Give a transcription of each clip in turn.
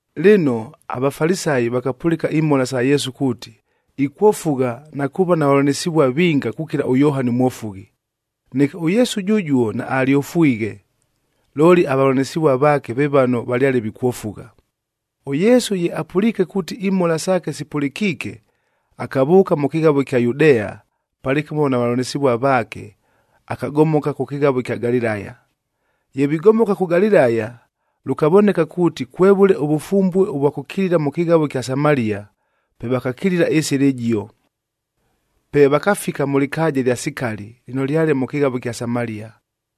Lɨno, aVafalisayi vakapʉlɨka imhola sa Yesu kuuti, ikwofugha na kuuva na vavʉlanɨsɨvua vinga kukila ʉYohani ʉMwofughi. Neke ʉYesu jʉjuo naalyofwighe, looli avavʉlanɨsɨvua vaake ve vano valyale vikwofugha. ɄYesu ye apʉliike kuuti imhola saake sipʉlɨkiike, akavʉʉka mʉ kɨghavo ɨkya Yudea palɨkɨmo na vavʉlanɨsɨvua vaake, akagomoka kʉ kɨghavo ɨkya Galilaya. Ye vigomoka kʉ Galilaya, lʉkavoneka kuuti, kwevʉle ʉvʉfumbue ʉvwa kʉkilila mʉ kɨghavo ɨkya Samalia, pe vakakila ɨsɨla ɨjio. Pe vakafika mʉ lɨkaaja ɨlya Sikali lɨno lyale mʉ kɨghavo ɨkya Samalia.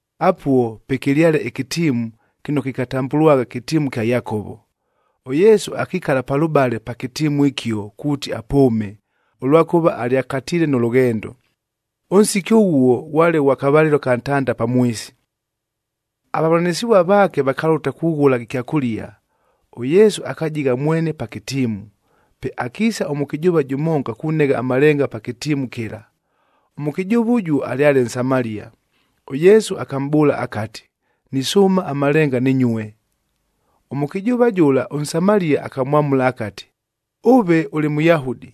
Apuo pwekɨlyale ɨkɨtiimu kɨno kɨkatambʉlwagha kɨtiimu kya Yakovo. ɄYesu akikala palʉbale pa kɨtiimu ɨkio kuuti apʉʉme, ʉlwakʉva alyakatiile nʉ lʉghendo. Ʉnsiki ʉghuo ghwale ghwa kavalɨlo aka ntanda pamwisi. Avavʉlanɨsɨvua vaake vakalʉta kughʉla ɨkyakʉlia, ʉYesu akajigha mwene pa kɨtiimu. Pe akiisa ʉmʉkɨjʉʉva jʉmonga kunegha amalenga pa kɨtiimu kɨla. Ʉmʉkɨjʉʉva ʉjuo alyale Nsamalia. ɄYesu akamʼbʉʉla akati, “Nisʉʉma amalenga nɨnyue.” Ʉmʉkɨjʉʉva jʉla ʉNsamalia akamwamʉla akati, “Ʉve ʉlɨ Mʉyahudi,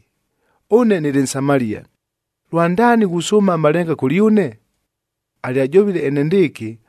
ʉne nɨlɨ Nsamalia, lwandaani ghusʉʉma amalenga kʉlyʉne?” Alyajovile enendɨɨkɨ,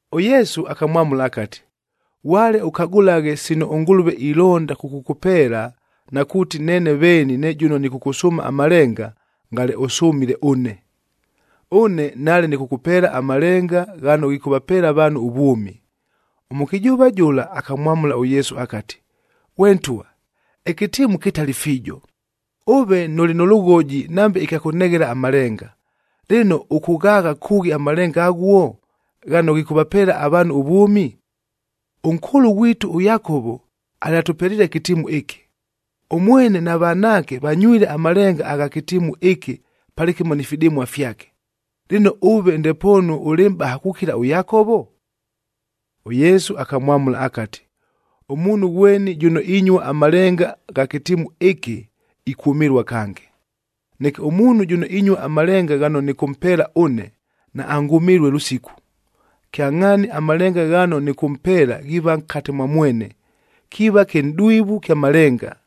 ɄYesu akamwamʉla akati, “Ghwale ʉkagʉlaghe sino ʉNgʉlʉve ilonda kʉkʉkʉpeela na kuuti neene veeni ne jʉno nɨkʉkʉsʉʉma amalenga, ngale ʉsʉmile ʉne. Ʉne nale nɨkʉkʉpeela amalenga ghano ghikʉvapeela avaanhu ʉvwʉmi.” Ʉmʉkɨjʉʉva jʉla akamwamʉla ʉYesu akati, “Ghwe ntwa, ɨkɨtiimu kɨtali fiijo, ʉve nʉlɨ nʉ lʉghoji nambe ɨkya kʉneghela amalenga, lɨno ʉkʉghaagha kʉʉghi amalenga aghuo, ghano ghikʉvapeela avaanhu ʉvwʉmi? Ʉnkʉʉlʉ ghwitu ʉYakovo alyatʉpeliile ɨkɨtiimu ɨkɨ. Ʉmwene na vanaake vanywile amalenga agha kɨtiimu ɨkɨ palɨkɨmo ni fidɨmua fyake. Lɨno ʉve ndepoonu ʉlɨ mʼbaha kukila ʉYakovo?” ɄYesu akamwamʉla akati, “Ʉmuunhu ghweni jʉno inyua amalenga gha kɨtiimu ɨkɨ, ikwʉmɨlua kange, neke ʉmuunhu jʉno inyua amalenga ghano nɨkʉmpeela ʉne, naangʉmɨlue lʉsiku. Kyangʼhaani amalenga ghano nɨkʉmpeela ghiiva nkate mwa mwene, kiiva kɨnʼdwivu kya malenga,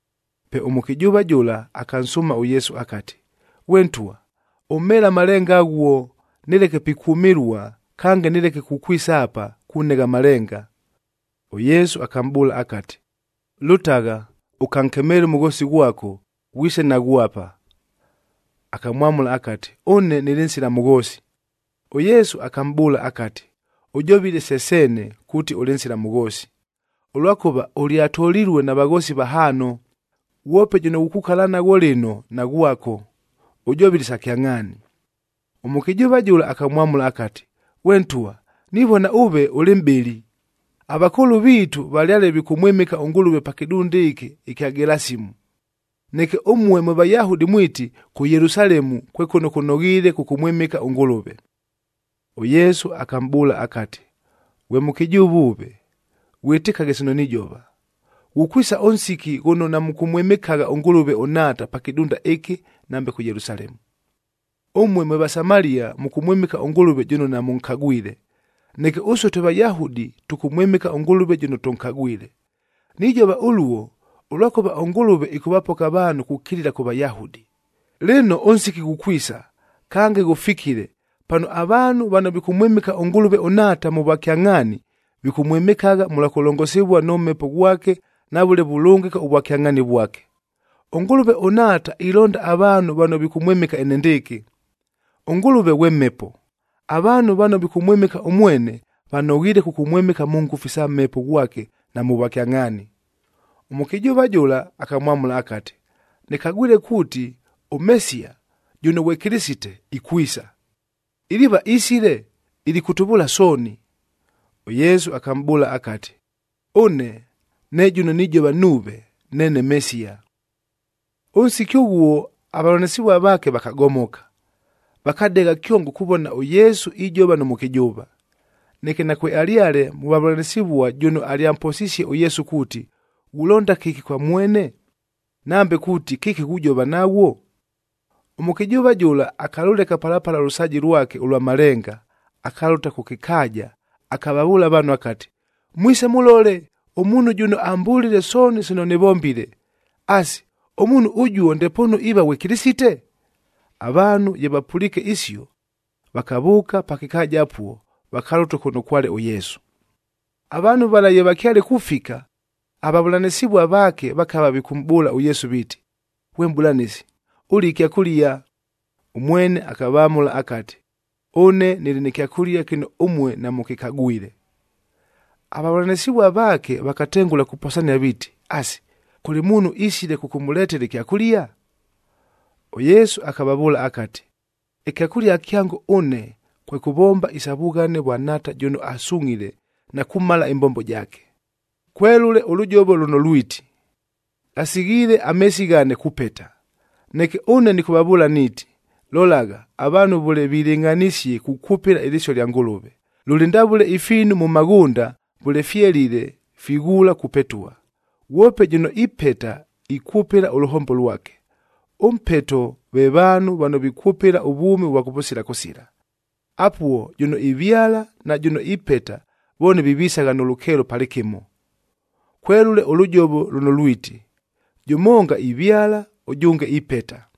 Pe ʉmʉkɨjʉʉva jʉla akansʉʉma ʉYesu akati, “Ghwe ntwa, ʉmheele amalenga aghuo, nɨleke pikwʉmɨlua, kange nɨleke kukwisa apa, kunegha amalenga!” ɄYesu akamʼbʉʉla akati, “Lʉtagha, ʉkankemeele ʉmʉghoosi ghwako, ghwise naghwo apa.” Akamwamʉla akati, “Ʉne nɨlɨ nsila mʉghoosi.” ɄYesu akamʼbʉʉla akati, “Ʉjovile se seene kuuti ʉlɨ nsila mʉghoosi, ʉlwakʉva ʉlyatolilue na vaghoosi vahaano, ghwope jʉno ghukukala naghwo lɨno, naghwako. Ʉjovile isa kyangʼhaani.” Ʉmʉkɨjʉʉva jʉla akamwamʉla akati, “Ghwe ntwa, nivona ʉve ʉlɨ mʼbɨli. Avakʉʉlʉ viitu valyale vikʉmwɨmɨka ʉNgʉlʉve pa kɨdunda ɨkɨ ɨkya Gelasimu,d neke ʉmue mwe Vayahudi mwiti, kʉ Yelusalemue kwe kʉno kʉnoghiile kʉkʉmwɨmɨka ʉNgʉlʉve.” ɄYesu akamʼbʉʉla akati, “Ghwe mʉkɨjʉʉva ʉve, ghwɨtɨkaghe sino nijova, ghukwisa ʉnsiki ghʉno namʉkʉmwɨmɨkagha ʉNgʉlʉve ʉNhaata pa kɨdunda ɨkɨ, nambe kʉ Yelusalemu. Ʉmue mwe Vasamalia mʉkʉmwɨmɨka ʉNgʉlʉve jʉno namʉnkagwile, neke ʉsue twe Vayahudi tʉkʉmwɨmɨka ʉNgʉlʉve jʉno tʉnkagwile. Nijova ʉluo, ʉlwakʉva ʉNgʉlʉve ɨkʉvapoka avaanhu kukilila kʉ Vayahudi. Lɨno ʉnsiki ghukwisa, kange ghʉfikile, pano avaanhu vano vikʉmwɨmɨka ʉNgʉlʉve ʉNhaata mʉ vwakyangʼhaani, vikʉmwɨmɨkagha mʉlwa kʉlongosivua nʉ Mhepo ghwake na vʉle vulʉngɨka ʉvwakyangʼhaani vwake. ɄNgʉlʉve ʉNhaata ilonda avaanhu vano vikʉmwɨmɨka enendɨɨkɨ. ɄNgʉlʉve ghwe Mhepo, avaanhu vano vikʉmwɨmɨka ʉmwene, vanoghiile kʉkʉmwɨmɨka mʉ ngʉfu isa Mhepo ghwake na mʉ vwakyangʼhaani.” Ʉmʉkɨjʉʉva jʉla akamwamʉla akati, “Nɨkagwile kuuti ʉMesiya, jʉno ghwe Kɨlɨsite, ikwisa. Iliiva isile, ilikʉtʉvʉʉla sooni.” ɄYesu akamʼbʉʉla akati, “Ʉne, ne jʉno nijova nuuve, neene Mesiya.” Ʉnsiki ʉghuo avavʉlanɨsɨvua vaake vakagomoka, vakadegha kyongo kuvona ʉYesu ijova nʉ mʉkɨjʉʉva.f Neke nakwealyale mʉ vavʉlanɨsɨvua jʉno alyamposisie ʉYesu kuuti, “Ghulonda kɨki kwa mwene?” Nambe kuuti, “Kɨki ghujova naghwo?” Ʉmʉkɨjʉʉva jʉla akalʉleka pala pala ʉlʉsaaji lwake ʉlwa malenga, akalʉta kʉ kɨkaaja, akavavʉʉla avaanhu akati, “Mwise mʉlole ʉmuunhu jʉno ambʉlile sooni sino nɨvombile. Asi, ʉmuunhu ʉjuo ndepoonu iiva ghwe Kɨlɨsite?” Avaanhu ye vapʉliike isio, vakavʉʉka pa kɨkaaja apuo, vakalʉta kʉno kwale ʉYesu. Avaanhu vala ye vakyale kufika, avavʉlanɨsɨvua vaake vakava vikʉmʼbʉʉla ʉYesu viiti, “Ghwe Mʼbʉlanɨsi, ʉlie ɨkyakʉlia.” Ʉmwene akavamʉla akati, “Ʉne nɨlɨ nɨ kyakʉlia kɨno ʉmue namʉkɨkagwile.” Avavʉlanɨsɨvua vaake vakatengʉla kuposania viiti, “Asi, kʉlɨ muunhu isile kʉkʉmʉletela ɨkyakʉlia?” ɄYesu akavavʉʉla akati, “Ɨkyakʉlia kyango ʉne, kwe kʉvomba isa vughane vwa Nhaata jʉno asungʼhile na kumala ɨmbombo jaake. Kwelʉle ʉlʉjovo lʉno lwiti, ‘Ghasighiile ameesi ghane kupeta.’ Neke ʉne nɨkʉvavʉʉla niiti, lolagha avaanhu vʉle vilɨngʼhanisie kukwʉpɨla ɨlɨsio lya Ngʉlʉve, lʉlɨ ndavʉle ifiinu mʉ maghʉnda vʉle fyelile, fighuula kupetua. Ghwope jʉno ipeta ikwʉpɨla ʉlʉhombo lwake, ʉmpeto ve vaanhu vano vikwʉpɨla ʉvwʉmi ʉvwa kʉvʉsila kʉsila. Apuo jʉno ivyala na jʉno ipeta vooni vivisagha nʉ lʉkeelo palɨkɨmo. Kwelʉle ʉlʉjovo lʉno lwiti, ‘Jʉmonga ivyala, ʉjʉnge ipeta.’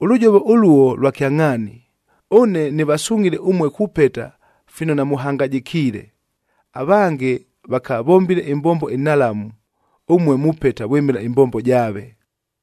Ʉlʉjovo ʉluo lwa kyangʼhaani. Ʉne nɨvasungʼhile ʉmue kupeta fino namʉhangajɨkiile. Avange vakavombile ɨmbombo ɨnhalamu, ʉmue mupeta vwɨmɨla ɨmbombo jaave.”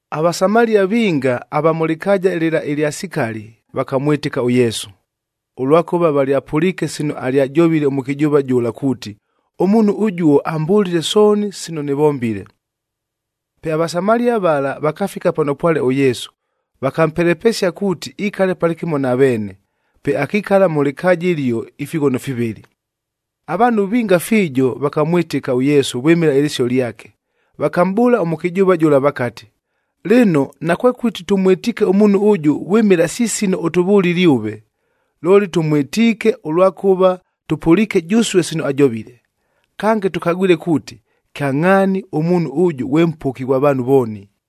AVasamalia vinga ava mʉ lɨkaaja lɨla ɨlya Sikali, vakamwɨtɨka ʉYesu, ʉlwakʉva valyapʉliike sino alyajovile ʉmʉkɨjʉʉva jʉla kuuti, “Ʉmuunhu ʉjuo ambʉlile sooni sino nɨvombile.” Pe aVasamalia vala vakafika pano pwale ʉYesu, vakampelepesia kuuti ikale palɨkɨmo na veene, pe akikala mʉ lɨkaaja ɨlio ifighono fivɨlɨ. Avaanhu vinga fiijo vakamwɨtɨka ʉYesu vwɨmɨla ɨlɨsio lyake. Vakamʼbʉʉla ʉmʉkɨjʉʉva jʉla vakati, “Lɨno, nakwekʉti tʉmwɨtiike ʉmuunhu ʉjʉ vwɨmɨla si sino ʉtʉvʉlile ʉve, looli tʉmwɨtiike, ʉlwakʉva tʉpʉliike jʉsue sino ajovile. Kange tʉkagwile kuuti, kyangʼhaani ʉmuunhu ʉjʉ ghwe Mpoki ghwa vaanhu vooni.”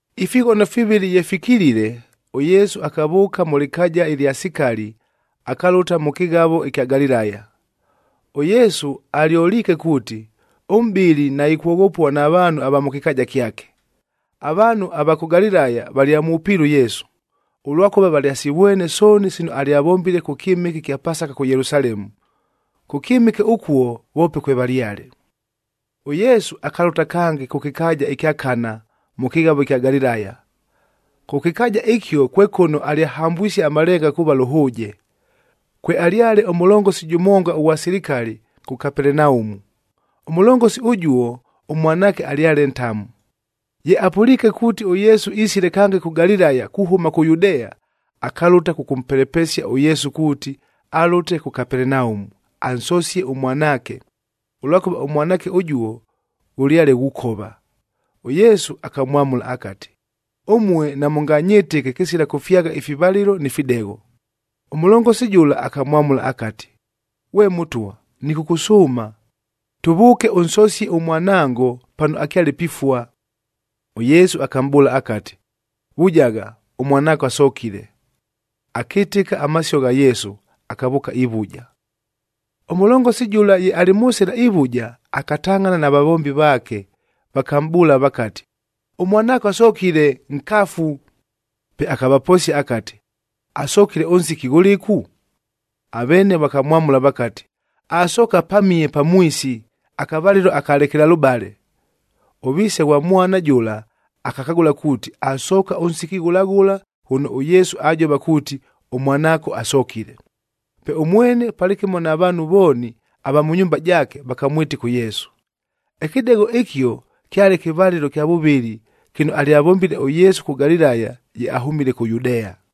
Ifighono fivɨlɨ ye fikilile, ʉYesu akavʉʉka mʉ lɨkaaja ɨlya Sikali akalʉta mʉ kɨghavo ɨkya Galilaya. ɄYesu alyoliike kuuti, ʉmʼbɨli naikwoghopua na vaanhu ava mʉ kɨkaaja kyake. Avaanhu ava kʉ Galilaya valyamwʉpiile ʉYesu, ʉlwakʉva valyasivwene sooni sino alyavombile kʉ kyɨmɨke ɨkya Pasaka kʉ Yelusalemu. Kʉ kyɨmɨke ʉkuo voope kwevalyale. ɄYesu akalʉta kange kʉ kɨkaaja ɨkya Kana mʉ kɨghavo ɨkya Galilaya. Kʉ kɨkaaja ɨkio kwe kʉno alyahambwisie amalenga kuuva lʉhʉʉje. Kwealyale ʉmʉlongosi jʉmonga ʉghwa silikali kʉ Kapelenaumu. Ʉmʉlongosi ʉjuo ʉmwanaake alyale ntamu. Ye apʉliike kuuti ʉYesu isile kange kʉ Galilaya kuhʉma kʉ Yudea, akalʉta kʉkʉmpelepesia ʉYesu kuuti alʉte kʉ Kapelenaumu, ansosie ʉmwanaake, ʉlwakʉva ʉmwanaake ʉjuo ghʉlyale ghukova. ɄYesu akamwamʉla akati, “Ʉmue, namʉnganyɨtɨke kɨsila kʉfyagha ifivalɨlo ni fidegho!” Ʉmʉlongosi jʉla akamwamʉla akati, “Ghwe Mʉtwa, nɨkʉkʉsʉʉma, tʉvʉʉke ʉnsosie ʉmwanango pano akyale pifua.” ɄYesu akamʼbʉʉla akati, “Vujagha, ʉmwanaako asokile.” Akɨtɨka amasio gha Yesu, akavʉʉka ivuja. Ʉmʉlongosi jʉla ye alɨ mʉ sɨla ivuja, akatangʼhana na vavombi vaake, vakamʼbʉʉla vakati, “Ʉmwanaako asokile, nkafu.” Pe akavaposia akati, “Asokile ʉnsiki ghʉlɨku?” Aveene vakamwamʉla vakati, “Asooka pamihe pamwisi, akavalɨlo aka lekelalʉbale.” Ʉviise ghwa mwana jʉla akakagʉla kuuti asooka ʉnsiki ghʉla ghʉla ghʉno ʉYesu ajova kuuti, “Ʉmwanaako asokile.” Pe ʉmwene palɨkɨmo na vaanhu vooni ava mʉ nyumba jaake vakamwɨtɨka ʉYesu. Ɨkɨdegho ɨkio kyale kɨvalɨlo kya vʉvɨlɨ kɨno alyavombile ʉYesu kʉ Galilaya ye ahʉmile kʉ Yudea.